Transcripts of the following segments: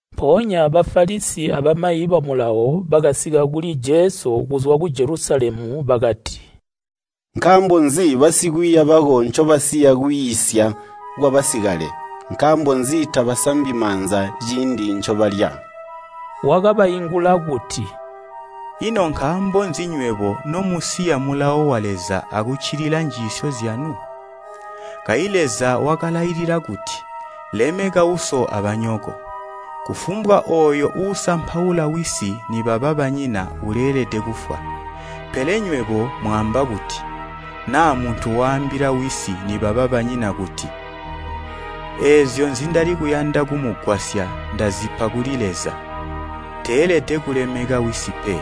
Mpoonya Bafalisi abamayi ba Mulawo bakasika kuli Jesu kuzwa ku Jelusalemu bakati, “Nkaambo nzi basikwiiya bako ncobasiya kwiisya kwabasikale? Nkaambo nzi tabasambi maanza ciindi ncobalya?” Wakabaingula kuti, “Ino nkaambo nzi nywebo nomusiya mulawo wa Leza akuccilila njiisyo zyanu? Kayi Leza wakalailila kuti, ‘Lemeka uso abanyoko, kufumbwa ooyo uusampaula wisi nibaba banyina uleelede kufwa.’ Pele nywebo mwaamba kuti, ‘Naa muntu waambila wisi nibaba banyina kuti, “Eezyo nzindali kuyanda kumugwasya ndazipa kuli Leza,” teelede kulemeka wisi pe.’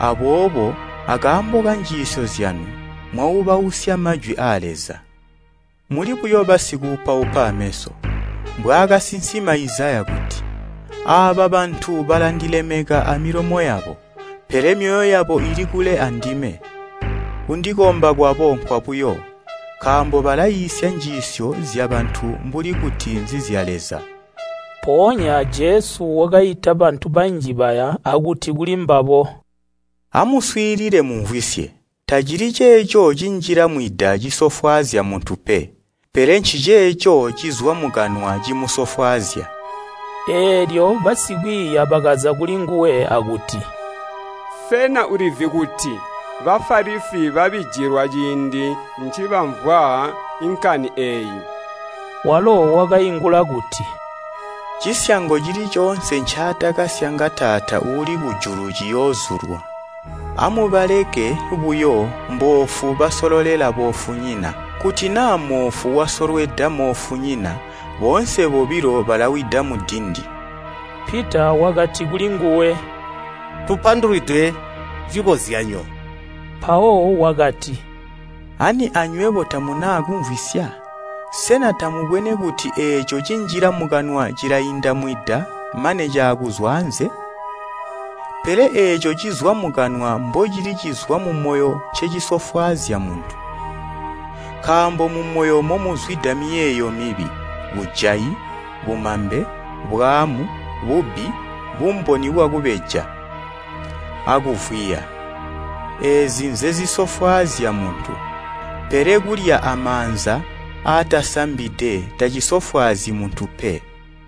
Aboobo akaambo kanjiisyo zyanu mwaubausya majwi aa Leza. Muli buyo basikuupaupa aameso. Mbwaakasinsima Izaya kuti, ‘Aaba bantu balandilemeka amilomo yabo, pele myoyo yabo ili kule andime, Kundikomba kwabo nkwabuyo, nkaambo balaiisya njiisyo zyabantu mbuli kuti nzizya Leza!’” Mpoonya Jesu wakaita bantu banji baya akuti kulimbabo, “Amuswiilile mumvwisye. Tacili ceeco cinjila mwida cisofwaazya muntu pe, pele nciceeco cizwa mukanwa cimusofwaazya.” Eelyo basikwiiya bakaza kulinguwe akuti, “Sena ulizi kuti Bafalisi babijilwa ciindi ncibamvwa nkani eeyi?” Walo wakaingula kuti, “Cisyango cili coonse ncaatakasyanga Taata uuli kujulu ciyoozyulwa. Amubaleke buyo, mboofu basololela boofunyina. Kuti naa moofu wasolweda moofunyina, boonse bobilo balawida mudindi.” Pita wakati kulinguwe, “Tupandulwide cikozyanyo.” Mpawo wakati, “Ani anywebo tamuna kumvwisya? Sena tamubwene kuti eeco cinjila mukanwa cilainda mwida mane caakuzwa anze? Pele eeco cizwa mukanwa mbocili cizwa mumoyo ncecisofwaazya muntu. Nkaambo mumoyo momuzwida miyeeyo mibi, bujayi, bumambe, bwaamu, bubbi, bumboni bwakubeja, akuvwiya. Eezi nzezisofwaazya muntu, pele kulya amaanza aatasambide tacisofwaazyi muntu pe.”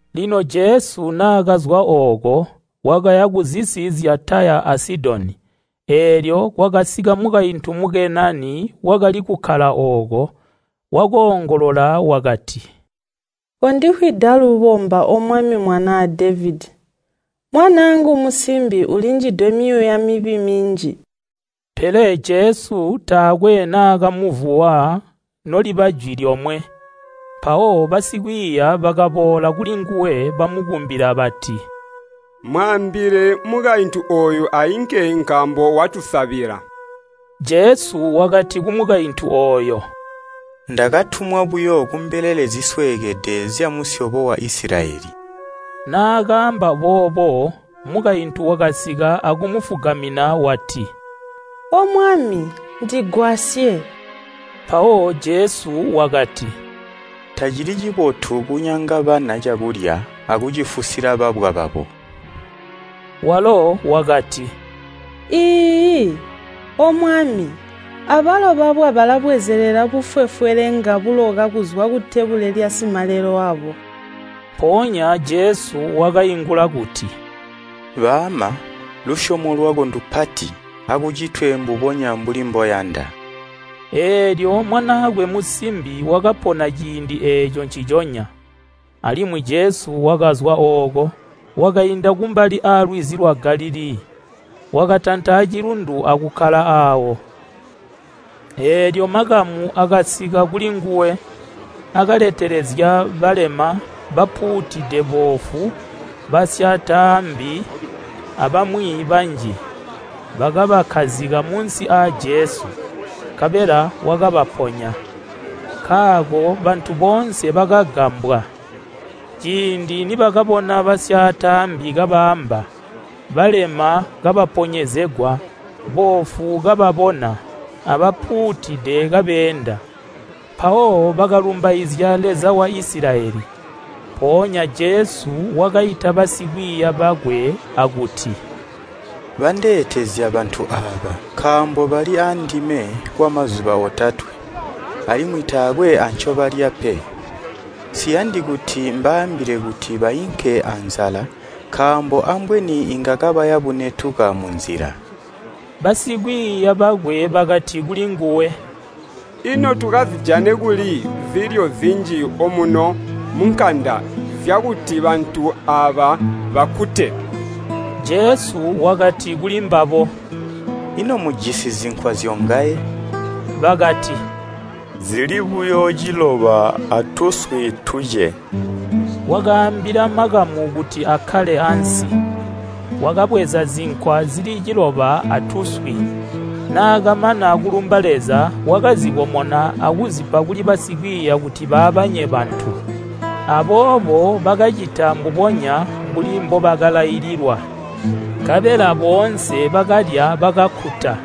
Lino Jesu naakazwa ooko, wakaya kuzisi zya Taya a Sidoni. Eelyo kwakasika mukaintu Mukenani wakali kukkala ooko. Wakoongolola wakati, “Kondifwida lubomba O Mwami Mwanaa Devedi, mwanaangu musimbi ulinjidwe myuuya mibi minji.” Pele Jesu taakwe naakamuvuwa noliba jwi lyomwe. Mpawo basikwiiya bakaboola kulinguwe bamukumbila bati, “Mwaambile mukaintu ooyu ainke nkaambo watusabila.” Jesu wakati kumukaintu ooyo, “Ndakatumwa buyo kumbelele zisweekede zyamusyobo wa Isilayeli.” Naakaamba boobo mukaintu wakasika akumufugamina wati, “O Mwami ndigwasye.” Mpawo Jesu kuti, “Tacili cibotu kunyanga bana cakulya akucifusila babwa.” Walo wakati, “Iiyi, O Mwami, abalo babwa balabwezelela bufwefwelenga buloka kuzwa kutebule lyasimalelo wabo.” Mpoonya Jesu wakaingula kuti, “Baama, lusyomo lwako ndupati! Akucitwe mbubonya mbuli mboyanda.” Eelyo mwanaakwe musimbi wakapona ciindi eeco nciconya. Alimwi Jesu wakazwa ooko, wakainda kumbali aalwizi lwa Galilii. Wakatanta acilundu akukkala aawo. Eelyo makamu akasika kulinguwe, akaletelezya balema, bapuutide boofu, basyaataambi abamwi banji. Bakabakkazika munsi aa Jesu, nkabela wakabaponya, nkaako bantu boonse bakagambwa, ciindi nibakabona basyaataambi kabaamba, balema kabaponyezegwa, boofu kababona, abapuutide kabeenda. Mpawo bakalumbaizya Leza wa Isilayeli. Mpoonya Jesu wakaita basikwiiya bakwe akuti, “Bandeetezya bantu aaba, nkaambo bali aandime kwamazuba otatwe, alimwi taakwe ancobalya pe. Nsiyandi kuti mbaambile kuti bainke anzala nkaambo ambweni inga kabaya bunetuka munzila.” Basikwiiya bakwe bakati kulinguwe, “Ino tukazijane kuli zilyo zinji omuno munkanda zyakuti bantu aaba bakkute?” Jesu wakati kulimbabo, “Ino mujisi zinkwa zyongaye?” Bakati, “Zili buyo ciloba atuswi tuce.” Wakaambila makamu kuti akkale ansi. Wakabweza zinkwa zili ciloba atuswi, naakamana kulumba Leza wakazikomona akuzipa kuli basikwiiya kuti baabanye bantu. Aboobo bakacita mbubonya mbuli mbobakalaililwa. Nkabela boonse bakalya bakakkuta,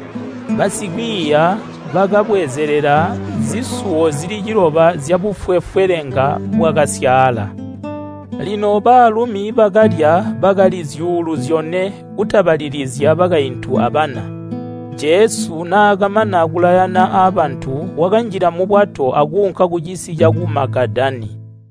basikwiiya bakabwezelela zisuwo zili ciloba zyabufwefwelenga bwakasyaala. Lino baalumi bakalya bakali zyuulu zyone kutabalilizya bakaintu abana. Jesu naakamana kulayana abantu wakanjila mubwato akuunka kucisi caku Magadala.